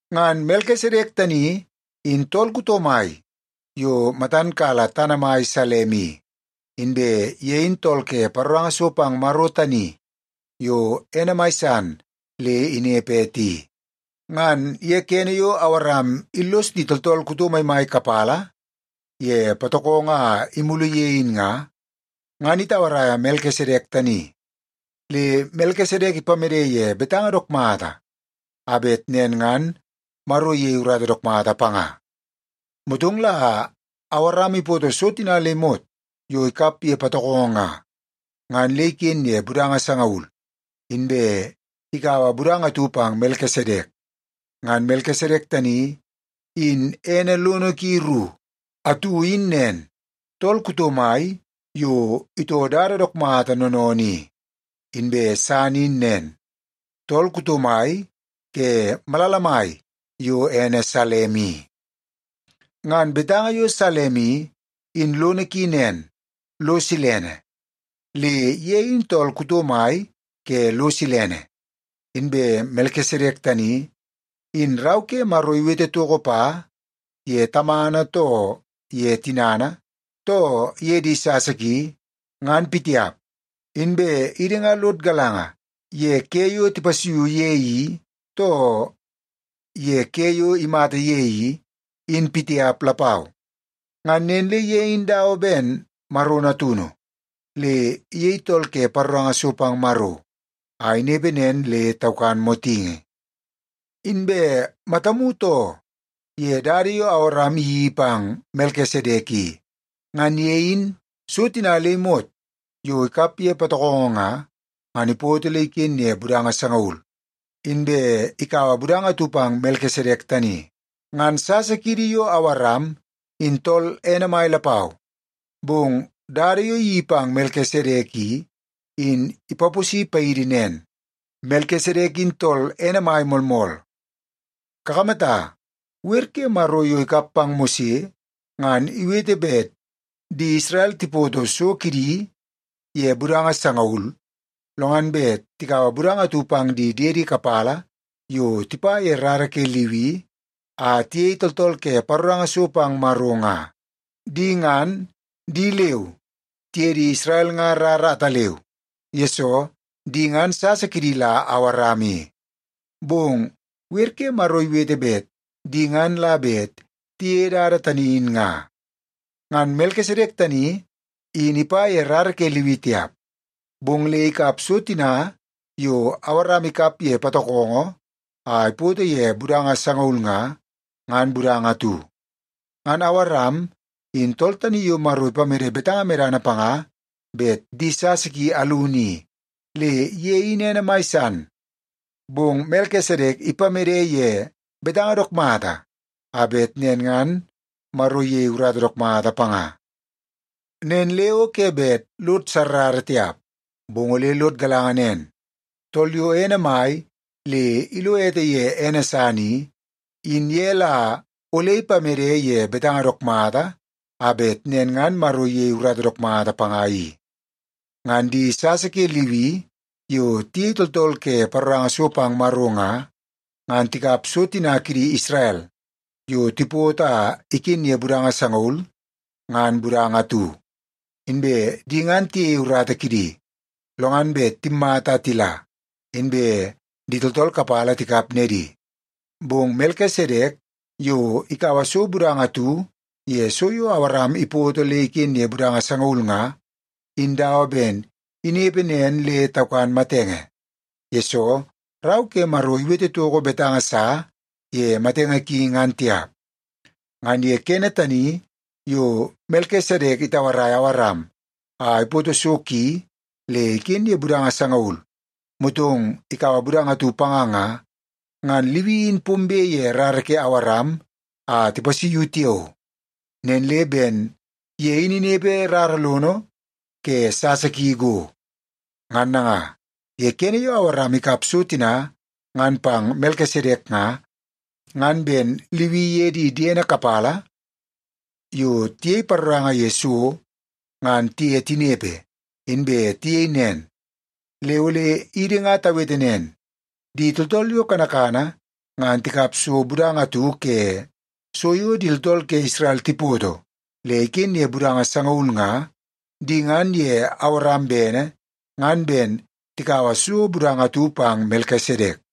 Ngan Melkisedek tani in tool kuto mai yo matan kala tana mai Salem i, inbe ye in tool ke paroranga so pang Maro tani yo ene mai san le inepe ete i. Ngan ye kene yo Awaram illos di tooltool kuto maimai kapala ye patokongo a imulu ye in nga, ngan itauaraia Melkisedek tani, le Melkisedek ipamede ye betanga dook mata a bet nen ngan Maro iyei urata dook mata panga. Motong la Awaram ipoto so tina le imot yo ikap ye patokongo nga, ngan le iken ye budanga sangaul, inbe ikaua budanga atu pang Melkisedek. Ngan Melkisedek tani in ene lono ki ru: atu in nen, “Tool kuto mai yo itoo dada dook mata noonoonoo i”, inbe san in nen, “Tool kuto mai ke malala mai yo ene Salem i.” Ngan betanga yo Salem i, in lono ki nen, lo silene. Le ye in tool kuto mai ke lo silene. Inbe Melkisedek tani, in Rau ke Maro iwete toko pa ye tamana, too ye tinana, too ye di sasa ki, ngan pitiap. Inbe idi nga lod galanga ye ke yo tipasuiu ye i, too ye ke yo imata ye i, in pitiap lapau. Ngan nen le ye in dawa ben Maro Natunu, le iyei tool ke paroranga so pang Maro, a inepe nen le taukan motingi. Inbe matamu too ye dada yo Awaram iyeii pang Melkisedek i. Ngan ye in, so tina le imot yo ikap ye patokongo nga, ngan ipoto le iken ye budanga sangaul, inbe ikaua budanga atu pang Melkisedek tani. Ngan sasa kiidi yo Awaram in tool ene mai lapau, bong dada yo iyeii pang Melkisedek i, in ipaposi paidi nen, Melkisedek in tool ene mai moolmool. Kakamata, wer ke Maro yo ikap pang Mose, ngan iwete bet di Isrel tipoto so kidi ye budanga sangaul, lo ngan bet tikaua budanga atu pang di diedi kapala yo tipa ye rara ke Liwi a tiyei tooltool ke paroranga so pang Maro nga. Di ngan, di leu tiye di Isrel nga rara ataleu, yesoo di ngan sasa kidi la Awaram i, bong wer ke Maro iwete bet di ngan la bet tiyeie dada tani in nga. Ngan Melkisedek tani, in ipa ye rara ke Liwi tiap, bong le ikap so tina yo Awaram ikap ye patokongo a ipoto ye budanga sangaul nga, ngan budanga atu. Ngan Awaram, in tool tani yo Maro ipamede betanga medana panga bet di sasa ki alunu i, le ye in ene mai san. Bong Melkisedek ipamede ye betanga dook mata a bet nen ngan Maro iyei urata dook mata panga. Nen le o ke bet lod sarrara tiap, bong ole lod galanga nen, tool yo ene mai le ilo ete ye ene san i, in ye la ole ipamede ye betanga dook mata a bet nen ngan Maro iyei urata dook mata panga i. Ngan di sasa ke Liwi yo tiyei tooltool ke paroranga so pang Maro nga, ngan tikap so tina kidi Isrel yo tipoto a iken ye budanga sangaul, ngan budanga atu. Inbe di ngan tiyeie urata kidi, lo ngan bet timmata a tila inbe di tooltool kapala tikap nedi. Bong Melkisedek yo ikaua so budanga atu ye so yo Awaram ipoto le iken ye budanga sangaul nga, in dawa ben inepe nen le taukan matenge, yesoo Rau ke Maro iwete toko betanga sa ye matenge ki ngan tiap. Ngan ye kene tani yo Melkisedek itauaraia Awaram a ipoto so ki le iken ye budanga sangaul motong ikaua budanga atu panga nga, ngan Liwi in pombe ye rara ke Awaram a tipasuiu tiao. Nen le ben ye in inepe rara lono ke sasa ki go. Ngan nanga, ye kene yo Awaram ikap so tina ngan pang Melkisedek nga, ngan ben Liwi iye di diene kapala yo tiyei paroranga ye so ngan tiye tinepe, inbe tiyei nen. Le ole idi nga tawete nen, di tooltool yo kanakana ngan tikap so budanga atu ke so yo di tooltool ke Isrel tipoto le iken ye budanga sangaul nga, di ngan ye Awaram bene ngan ben tikaua so budanga atu pang Melkisedek.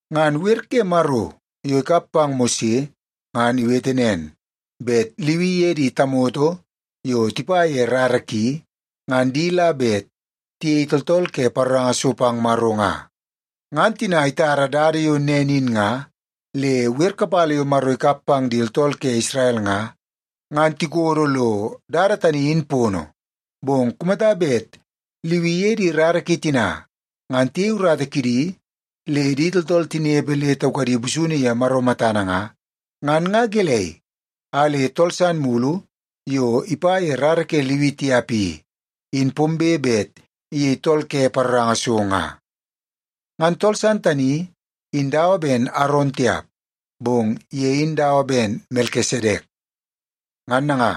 Ngan wer ke Maro yo ikap pang Mose ngan iwete nen, bet Liwi iye di tamoto yo tipa ye rara ki, ngan di la bet tiyei tooltool ke paroranga so pang Maro nga. Ngan tina itara dada yo nen in nga, le wer kapala yo Maro ikap pang di tooltool ke Isrel nga, ngan tikodo lo dada tani in pono. Bong kumata bet Liwi iye di rara ki tina ngan tiyei urata kidi le di tooltool tinepe le taukadi busunu ye Maro matana nga, ngan nga gelei a le tool san mulu yo ipa ye rara ke Liwi tiap i, in pombe bet iyei tool ke paroranga so nga? Ngan tool san tani in dawa ben Aron tiap, bong ye in dawa ben Melkisedek. Ngan nanga,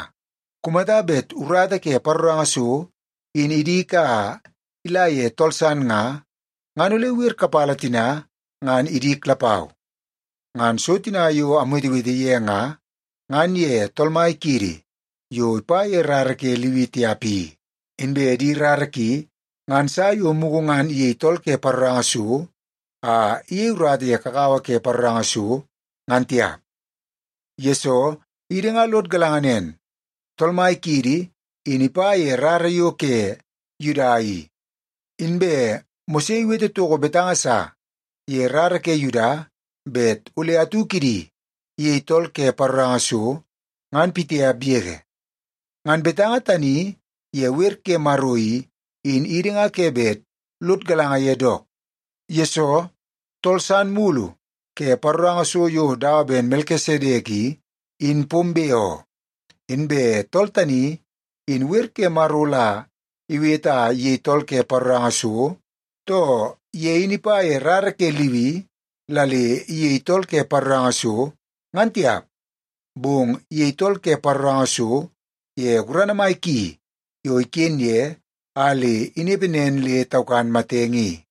kumata bet urata ke paroranga so in idik a ila ye tool san nga, ngan ole wer kapala tina ngan idik lapau. Ngan so tina yo amwetewete ye nga, ngan ye Tool Mai kiidi, yo ipa ye rara ke Liwi tiap i. Inbe di rara ki ngan sa yo mugu ngan iyei tool ke paroranga so a iyei urata ye kakawa ke paroranga so, ngan tiap. Yesoo, idi nga lod galanga nen, Tool Mai kiidi in ipa ye rara yo ke Yuda i. Inbe Mose iwete toko betanga sa ye rara ke Yuda bet ole atu kidi iyei tool ke paroranga so, ngan pitiap yege. Ngan betanga tani ye wer ke Maro i, in idi nga ke bet lod galanga ye dook, yesoo tool san mulu ke paroranga so yo dawa ben Melkisedek i, in pombe oo. Inbe tool tani, in wer ke Maro la iwete a iyei tool ke paroranga so, too ye in ipa ye rara ke Liwi la le iyei tool ke paroranga so, ngan tiap. Bong iyei tool ke paroranga so ye gurana mai ki yo iken ye a le inepe nen le taukan matenge i.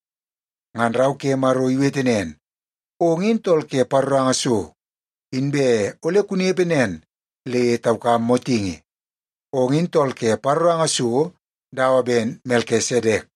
Ngan Rau ke Maro iwete nen, “Ong in tool ke paroranga so inbe ole kunepe nen le taukam motingi. Ong in tool ke paroranga so dawa ben Melkisedek.”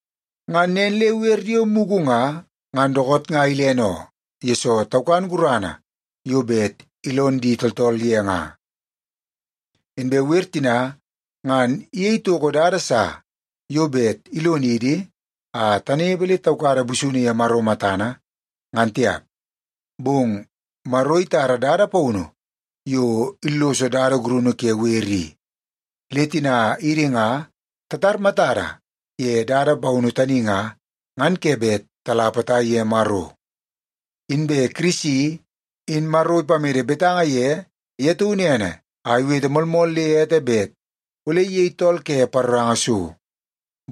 Ngan nen le wer yo mugu nga, ngan dookoot nga ilene oo, yesoo taukan gurana yo bet ilon di tooltool ye nga. Inbe wer tina ngan iyei toko dada sa yo bet ilonidi a tanepe le taukada busunu ye Maro matana, ngan tiap. Bong Maro itara dada paunu yo illoso dada gurunu ke wer i, le tina idi nga tatar matada ye dada paunu tani nga, ngan ke bet tala potai ye Maro. Inbe Kirisi, in Maro ipamede betanga ye ye taunu ene a iwete moolmool le ete bet ole iyei tool ke paroranga so.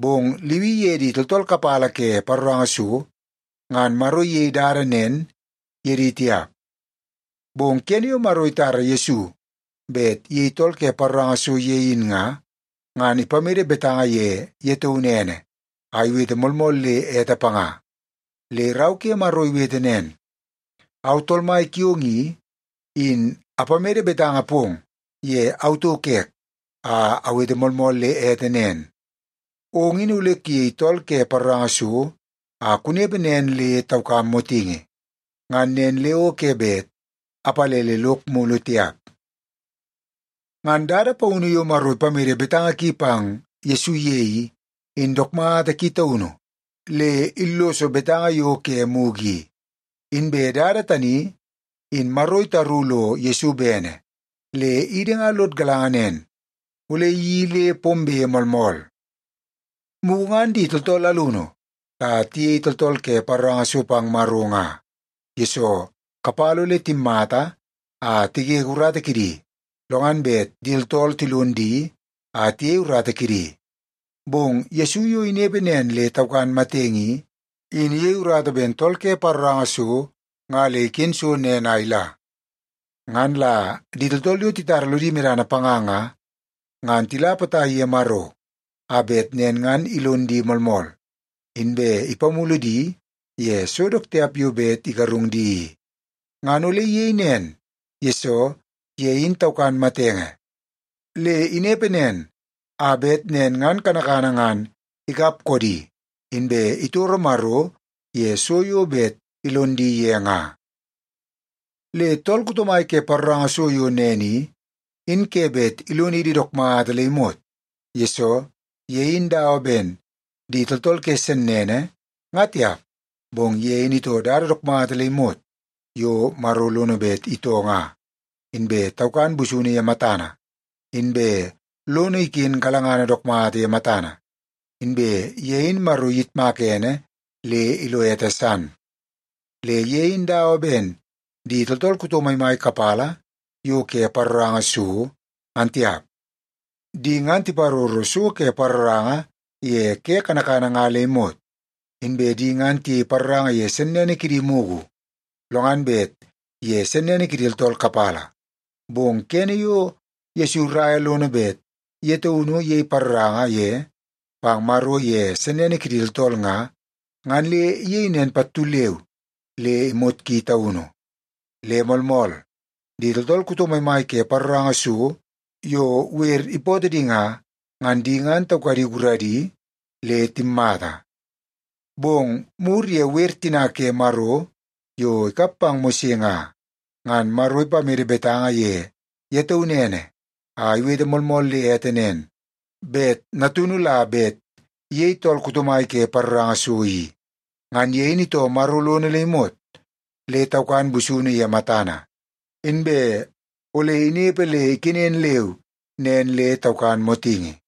Bong Liwi iye di tooltool kapala ke paroranga so, ngan Maro iyei dada nen ye di tiap. Bong kene yo Maro itara Yesu bet iyei tool ke paroranga so ye in nga, ngan ipamede betanga ye ye taunu ene a iwete moolmool le ete panga. Le Rau ke Maro iwete nen, “Au Tool Mai kiong i, in apamede betanga pong ye au tauk ek a awete moolmool le ete nen, ‘Ong in ole kuyei tool ke paroranga so a kunepe nen le taukam motingi.’ Ngan nen le o ke bet apalele lok mulu tiap.” Ngan dada paunu yo Maro ipamede betanga ki pang Yesu ye i, in dook mata ki taunu le illoso betanga yo ke mugu i. Inbe dada tani, in Maro itaru lo Yesu bene, le idi nga lod galanga nen, ole iyeii le pombe moolmool. Mugu ngan di tooltool alunu la tiyei tooltool ke paroranga so pang Maro nga, yesoo kapala ole timmata a tigege urata kidi, lo ngan bet di tooltool tilon di a tiyei urata kidi. Bong Yesu yo inepe nen le taukan matenge i, in iyei urata ben tool ke paroranga so nga le iken so nen a ila. Ngan la di tooltool yo titara lodi medana panga nga, ngan tila potai ye Maro, a bet nen ngan ilon di moolmool, inbe ipamulu di ye so dook tiap yo bet igarung di i. Ngan ole iyei nen, yesoo ye in taukan matenge, le inepe nen a bet nen ngan kanakana ngan ikap koodi, inbe itoro Maro ye so yo bet ilon di ye nga. Le tool kuto mai ke paroranga so yo nen i, in ke bet ilonidi dook mata le imot. Yesoo, ye in dawa ben di tooltool ke sennene, nga tiap, bong ye in itoo dada dook mata le imot yo Maro lono bet itoo nga, inbe taukan busunu ye matana, inbe lono iken galangana dook mata ye matana, inbe ye in Maro iyitmaka ene le ilo ete san. Le ye in dawa ben di tooltool kuto maimai kapala yo ke paroranga so, ngan tiap. Di ngan tiparoro so ke paroranga ye ke kanakana nga le imot. Inbe di ngan tiyei paroranga ye sennene kidi mugu, lo ngan bet ye sennene kidi tooltool kapala. Bong kene yo Yesu iraia lono bet ye taunu iyei paroranga ye pang Maro ye sennene kidi tooltool nga, ngan le iyei nen pattu leu le imot ki taunu. Le moolmool, di tooltool kuto maimai ke paroranga so yo wer ipootoo di nga, ngan di ngan taukadi guradi le timmata. Bong mur ye wer tina ke Maro yo ikap pang Mose nga, ngan Maro ipamede betanga ye ye taunu ene a iwete moolmool le ete nen, bet Natunu la bet iyei tool kuto mai ke paroranga so i. Ngan ye in itoo Maro lono le imot, le taukan busunu ye matana, inbe ole inepe le ikenen leu nen le taukan motingi.